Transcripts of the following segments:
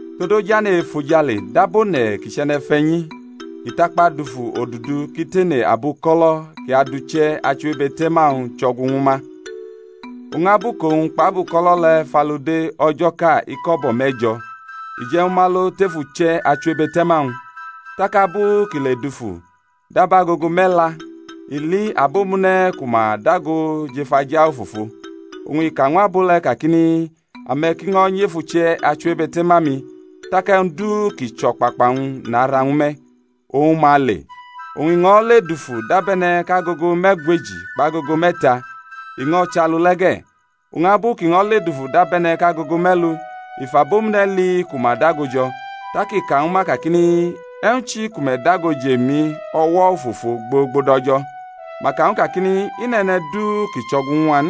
Todu ojane̩ e-efojale dab one̩ kʼi chʼe̩ne̩fe̩nyi, kʼi takpa dafu odudu kʼi tene abuko̩lo̩ kʼi adʼuche̩ achiwebe̩te̩ma-wñ chʼo̩gu ñwu ma. Oñ abu kʼowñ kpʼabuko̩lo̩ le̩ fʼalude o̩jo̩ʼka iko̩bo̩ me̩jo̩, i je̩ ñwu ma lo tef uche̩ achiwebe̩te̩ma-wñ. Tak abu kʼi le-dufu dab agogo me̩la, i li abomune̩ ku ma dago jʼef aja ofofo. Oñ i ka ñw abo le̩ kakini, Ame̩ ki ño̩ nyʼef uche̩ achiwebe̩te̩ma-mi, tak e̩wñ du kʼi chʼo̩kpakpa-wñ nara ñwu me̩. Oñ ma le. Oñ i ño̩ ledufu dabe̩ne̩ kʼagogo me̩gweji kpʼagogo me̩ta, i ño̩ chʼalu le̩ ge̩. Oñ abu kʼi ño̩ ledufu dabe̩ne̩ kʼagogo me̩lu, i fʼabomune̩ li ku ma dago jo̩; tak i ka ñwu ma kakini, E̩wñ chi ku me̩ dago jʼemi o̩wo̩ ofofo gbogbo dʼo̩jo̩? Ma ka ñw u kakini, I nʼe̩ne̩ du kʼi chʼo̩gu ñw a n.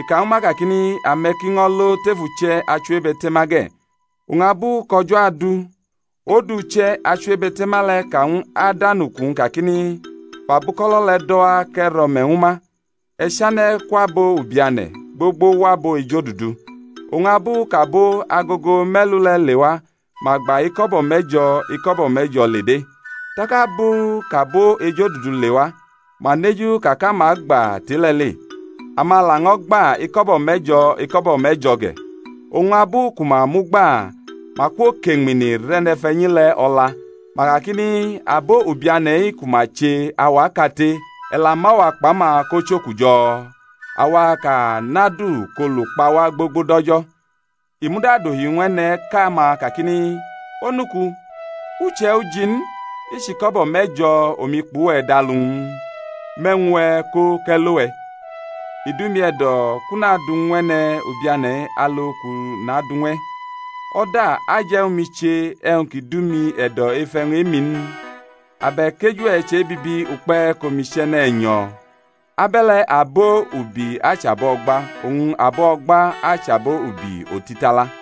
I ka ñwu ma kakini, Ame̩ ki ño̩ lo tef uche̩ achiwebe̩te̩ma ge̩. Oñ abu kʼo̩jo̩ adu, odu uche̩ achiwebe̩te̩ma le̩ ka ñw adanuku-wñ kakini, Fʼabuko̩lo̩ le̩ do̩ wa kʼe̩ rʼo̩me̩ ñwu ma; e̩ chane̩ kwʼabo ubiane̩ gbogbo wʼabo ejodudu. Oñ abu kʼabo agogo me̩lu le̩ lewa ma gba iko̩bo̩ me̩jo̩ iko̩bo̩ me̩jo̩ le de̩. Tak abu kʼabo ejodudu lewa, ma neju ka kʼama agba tʼe-le̩ le̩; ama laño̩ gba iko̩bo̩ me̩jo̩ iko̩bo̩ me̩jo̩ ge̩. Oñ abu ku ma mʼu gba, ma kwokʼeñmini rʼe̩ne̩fe̩nyi le̩ o̩la, ma kakini, Abo ubiane̩-i ku ma che auwaʼkate, e̩ la mʼawa kpʼama ko chʼokujo̩? awa kʼa nʼadu kʼolu kpa wa gbogbo dʼo̩jo̩. I muda dohi ñw e̩ne̩ʼka-ma kakini, Onuku, u chʼe̩ uji n, i chʼiko̩bo̩ me̩jo̩ omi kpʼuwe̩ dʼalu n? Mʼe̩wñ-we̩ ko kʼe̩ lo we̩. I dʼumi e̩do̩ kʼu nadʼu ñw e̩ne̩ ubiane̩-i alu kʼu nadʼu ñw e̩. O̩da aje̩ ñwu mi che e̩wñ ki dʼumi e̩do̩ ef e̩wñ e-mi n? Abe̩k eju-we̩ che bibi ukpe̩ kʼomi chʼe̩ne̩ e̩nyo̩? Abe̩le̩ abo ubi achʼabo o̩gba, oñ abo o̩gba achʼabo ubi otitala.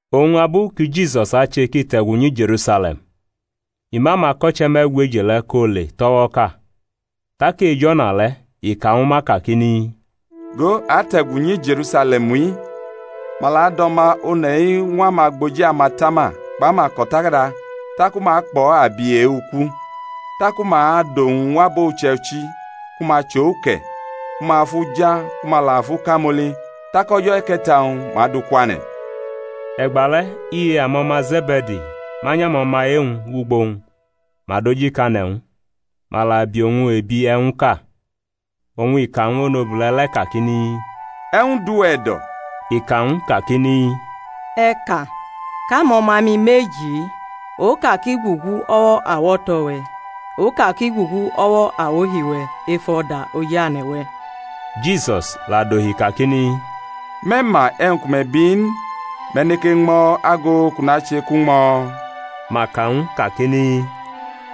Oñ abu ki Jisus ache kʼi te̩gu nyi Je̩rusale̩m, i mʼamako̩che me̩gweji le̩ ko le tʼo̩wo̩ʼka, tak ej o̩na le̩ i ka ñwu ma kakini, Go, a ate̩gu nyi Je̩rusale̩m-i, ma la adʼO̩ma One̩-i ñw amagboji amatama kpʼamako̩takada, taku ma akpʼo̩ abi e-uku. Taku ma adʼowñ ñw abo uche̩ichi ku ma chʼo uke̩, ku ma fʼu ja ku ma la fʼu kamoli. Tak o̩jo̩ e̩ke̩ta-wñ ma adʼu kwane̩. E̩gbale̩ iye amo̩ma Ze̩be̩di manyʼamo̩ma e-wñ wʼugbo-wñ, ma dojikane̩ ñw u, ma la bi owñ ebi e̩wñʼka. Oñ i ka ñw onobule̩ le̩ kakini, E̩wñ dʼuwe̩ e̩do̩? I ka ñw u kakini, E̩ ka, kʼamo̩ma-mi meji-i, oka ki gugu o̩wo̩ awo̩to̩-we̩, oka ki gugu o̩wo̩ awohi-we̩ ef o̩da ojane̩-we̩. Jisus la dohi kakini, Me̩ ma e̩wñ ku me̩ biʼi n. Me̩ neke ñmo̩ ago kʼu nache kʼu ñmo̩? Ma ka ñw u kakini,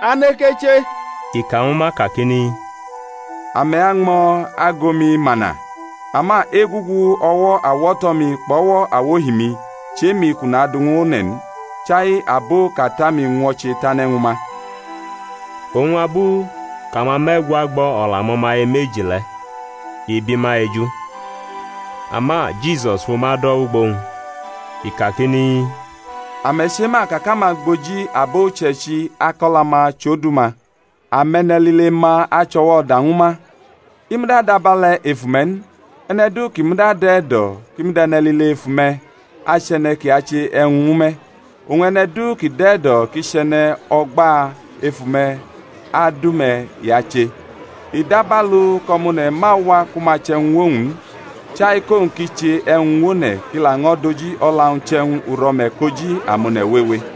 A neke che. I ka ñwu ma kakini, Ame̩ añmo̩ ago-mi, mana, ama egugu o̩wo̩ awo̩to̩-mi kpʼo̩wo̩ awohi-mi chʼe-mi kʼu nadʼu ñw one̩ n, chai abo kʼAta-mi ñwo̩che tane̩ ñwu ma. Oñ abu kʼamame̩gwa gbʼo̩ o̩la amo̩maye meji le̩, i bi ma eju. Ama Jisus fʼuma dʼo̩ wʼugbo-wñ i kakini, Ame̩ chema ka kʼamagboji abo uche̩ichi akʼo̩la-ma chʼodu-ma, ame̩ne̩lile-ma achʼo̩wo̩ o̩da ñwu ma. I muda dʼabe̩le̩ ef ume̩ n, e̩ne̩ du kʼi muda dʼe̩ e̩do̩ kʼi mud e̩ne̩lile ef ume̩, achʼe̩ne̩ kʼi ache e̩wñ ñwu me̩, oñ e̩ne̩ du ki dʼe̩ e̩do̩ kʼi chʼe̩ne̩ o̩gba ef ume̩, adu-me̩ i ache. I dabalu kʼO̩ma One̩ ma wa ku ma che e̩wñ ñw owñ n, chai kʼowñ ki che e̩wñ ñw one̩ kʼi laño̩ dʼoji o̩la-wñ chʼe̩wñ uro̩me̩ koji amone̩ wewe.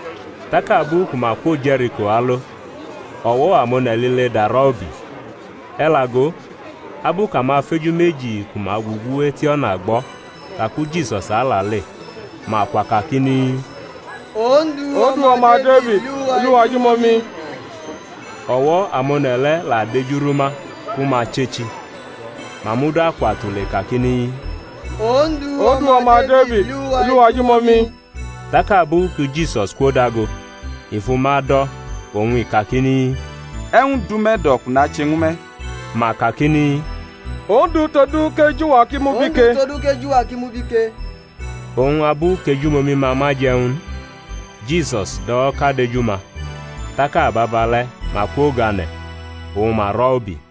Tak abu ku ma kwo Je̩riko alo, o̩wo̩ amone̩ lile darʼo̩ ubi. E̩ la go, abu kʼamafeju meji ku ma gugu et o̩na gbo̩ ka ku Jisus alale, ma kwa kakini, Ondu, O̩ma Defid, li uwa ejumomi! O̩wo̩ amone̩ le̩ la dejurʼuma ku ma chechi; ma muda kwa tule kakini, Ondu, O̩ma Defid, li uwa ejumomi! Tak abu ki Jisus kwodago, i fʼuma do̩, oñ i kakini, E̩wñ dʼume̩ e̩do̩ kʼu nache ñwu me̩? Ma kakini, Ondu, todu kʼeju-wa ki mubi ke. Oñ abu kʼejumomi-ma ma je̩ ñw u n, Jisus do̩wo̩kadʼeju-ma, tak ababale̩ ma kwogane̩, oñ ma rʼo̩ ubi.